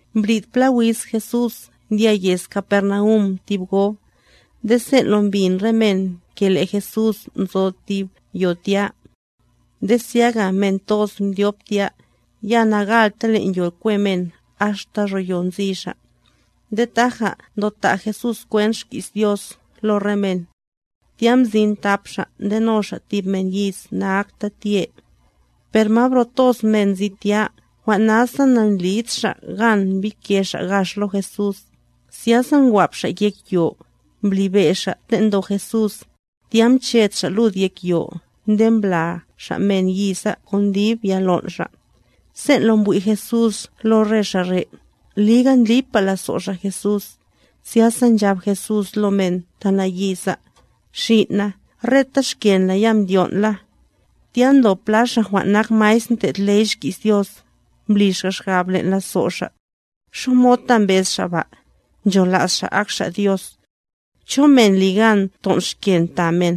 Mbrid pla wiz Jesús ndya yez Capernaum tib gob; nde sen' lo mbin re men le' Jesús nzo yo. Zyaga men toz mdyop tya, ya nagalta len' yo kwe men axta ro yo nzi xa'; nde taja ndo ta' Jesús kwent xki's Dios lo re men. Tya mzin thap xa' ndeno xa' thib men nayiz na'akta win. Per ma bro toz men nzi tya, jwan' nasa nandlid xa' gan mbike xa' gax lo Jesús, zyasa ngwap xa' yek yo, mblibe' xa' ten' ndo Jesús, tya mched xa' lud yek yo nde mbla xa' men yiza kon dib ya lon' xa'. Sen' lo mbwi' Jesús lo re xa' re', liga ndlipa lazo' xa' Jesús, zyasa nchab Jesús lo men ta nayiza: —Xin' na, reta xken la ya mdyon'la. Tya ndob pla xa' jwan' nak maestr ndlo' ley xki's Dios, mbli xa' xgab len' lazo' xa': “¿Xamod ta mbez Xa' ba? Nchola's Xa' ak Xa' Dios. ¿Cho men ligan ton' xken ta men?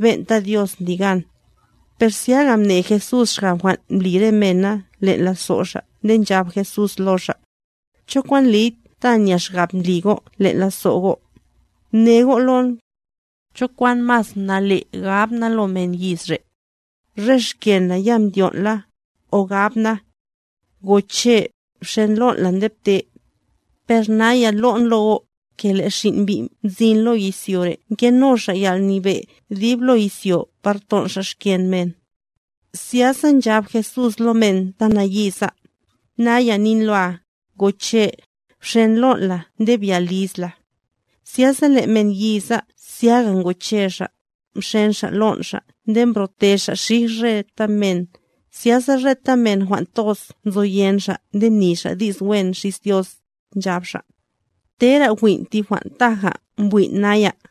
Ben'ta Dios ndli gan.” Per zyaga mne Jesús xgab jwan' mbli re mena len' lazo' xa' nde nchab Jesús lo xa': —¿Cho kwan ndliy ta nya xgab ndli go' len' lazo' go'? Mne go' lon. ¿Cho kwan mas nale' gab na lo men yiz re': “Re xken la ya mdyon' la,” o gab na: “Goche', bxen lon' la nde pte”? Per naya lo'n lo go', ke le' Xin' Mbi' mzin lo izyo re' ngeno Xa' yalnyebe' dib lo izyo par ton' Xa' xken men. Zyasa nchab Jesús lo men ta nayiza: —Naya nin loa, goche', bxen lon' la nde bya liz la. Zyasa le' men yiza zyaga ngoche xa', mxen xa' lon' xa' nde mbro'te xa' xij reta men, zyasa reta men jwan' toz nzoyen xa' nde mni xa' di's wen xis Dios, nchab xa': —¡Tera win' tib jwan' taja mbwin' naya!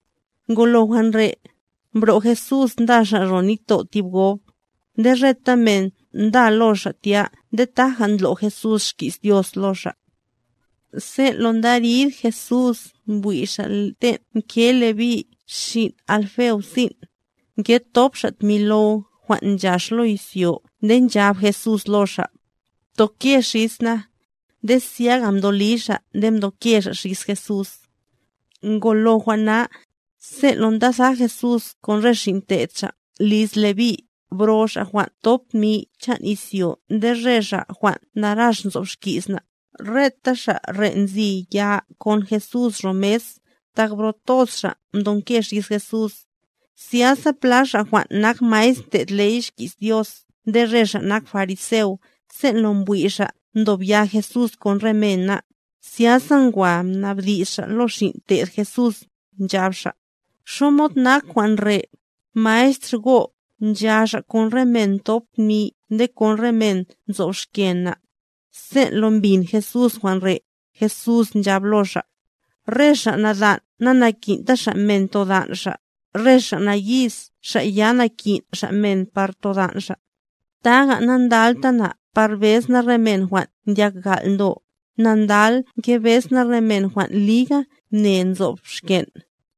Ngolo jwan' re', mbro' Jesús nda Xa' ro nitto' tib gob. Nde reta men nda lo Xa' tya nde taja ndlo' Jesús xki's Dios lo xa'. Sen' lo ndarid Jesús mbwi' Xa' ten' nge Levi' xin' Alfeo sin', ngethop xa' tmi low jwan' nchax lo izyo nde nchab Jesús lo xa': —Btoke xis na. Nde zyaga mdo li xa' nde mdoke xa' xis Jesús. Ngolo jwan' na, sen' lo ndatha Jesús kon re xin' te'd Xa' liz Leví, bro xa' jwan' nthop tmi chan' izyo nde re xa' jwan' narax nzob xki's na', reta xa' re' nzi ya kon Jesús ro mes, tak bro toz xa' mdonke xis Jesús. Zyasa pla xa' jwan' nak maestr ndlo' ley xki's Dios nde xa' nak fariseo, sen' lo mbwi' xa' ndob ya Jesús kon re mena, zyasa ngwa mnabdi's xa' lo xin' te'd Jesús, nchab xa': —¿Xamod nak jwan' re', Maestr go', ncha Xa' kon re men nthop tmi nde kon re men nzob xken na'? Sen' lo mbin Jesús jwan' re', Jesús nchab lo xa': —Re xa' nadan' nanaki'nta xa' men todan' xa', re xa' nayiz xa' ya nakin' xa' men par todan' xa'. Taga, nandalta na par bez na re men jwan' ndyak gal' ndo, na ndal ngebez na re men jwan' liga mne nzob xken'.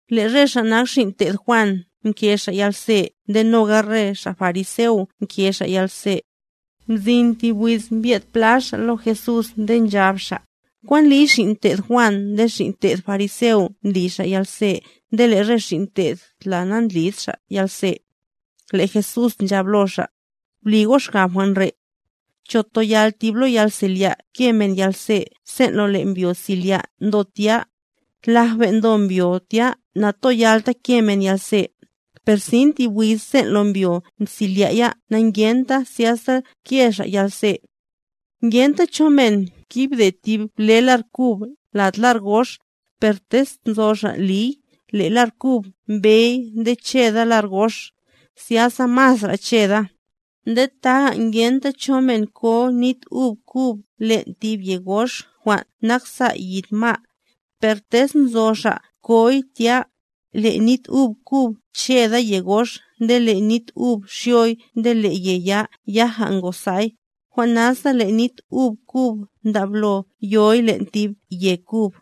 Le' re xa' nak xin' te'd Juan nke xa' yalze nde noga re xa' fariseo nke xa' yalze. Mzin tib wiz mbye'd pla xa' lo Jesús nde nchab xa': —¿Kwan ndliy, xin' te'd Juan nde xin' te'd fariseo ndli xa' yalze nde le' re xin' te'd la nandlid xa' yalze? Le' Jesús nchab lo xa': —Bli go' xgab jwan' re'. ¿Cho toyal tib lo yalselya' ke men yalze sen' lo le' mbyo selya' ndo tya? Laj ben' ndo mbyo tya natoyalta ke men yalze. Per sin tib wiz le' mbyo mselya' ya na'ngenta, zyasa ke xa' yalze. ’Ngenta cho men ngibde tib ble lar kub lad lar gox; per tez nzo xa' liy, le' lar kub mbey nde cheda lar gox, zyasa masra' cheda. Nde taga ngenta cho men ko nit ub kub len' tib ye gox jwan' naksa' yid ma'; per tez nzo xa' koy tya, le' nit ub kub cheda ye gox nde le' nit ub xyoy nde le' ye ya yaja ngosa'y; Jwan' nasa le' nit ub kub ndablo yoy len' tib ye kub.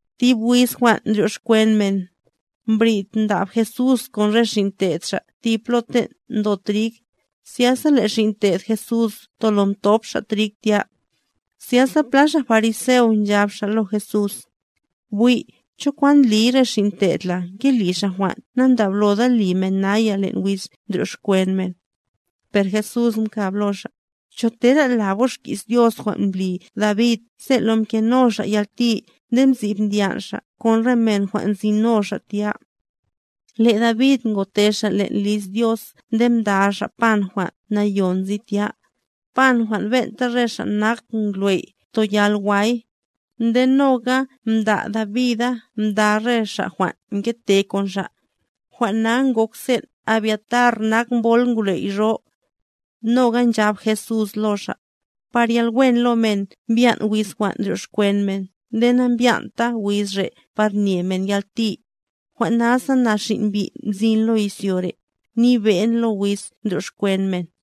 Tib wiz jwan' ndryoxkwen men, mbrid ndab Jesús kon re xin' te'd xa' tib plo ten' ndo trig, zyasa le' xin' te'd Jesús tolo mthop xa' trig tya. Zyasa pla xa' fariseo nchab xa' lo Jesús: —Bwi', ¿Cho kwan ndliy re xin' te'd la ngeli xa' jwan' nandabloda li men naya len' wiz ndryoxkwen men? Per Jesús mkab lo xa': —¿Cho tera lab go' xki's Dios jwan' mbli David sen' lo mkeno xa' yalti nde msib ndyan' xa' kon re men jwan' nzino xa' tya? Le' David ngote xa' len' liz Dios nde mda xa' pan jwan' Nayon nzi tya, pan jwan' ben'ta re xa' nak ngwley' toyal way; nde noga mda' Davida mda re xa' jwan' ngete kon xa'. Jwan' na ngok sen' Abiatar nak mbol ngwley' ro. Noga nchab Jesús lo xa': —Par yalwen lo men mbyan' wiz jwan' ndryoxkwen men nde nambyan'ta wiz re' par nye men yalti. Jwan' nasa, na Xin' Mbi' mzin lo izyo re', nyebe'n lo wiz ndryoxkwen men.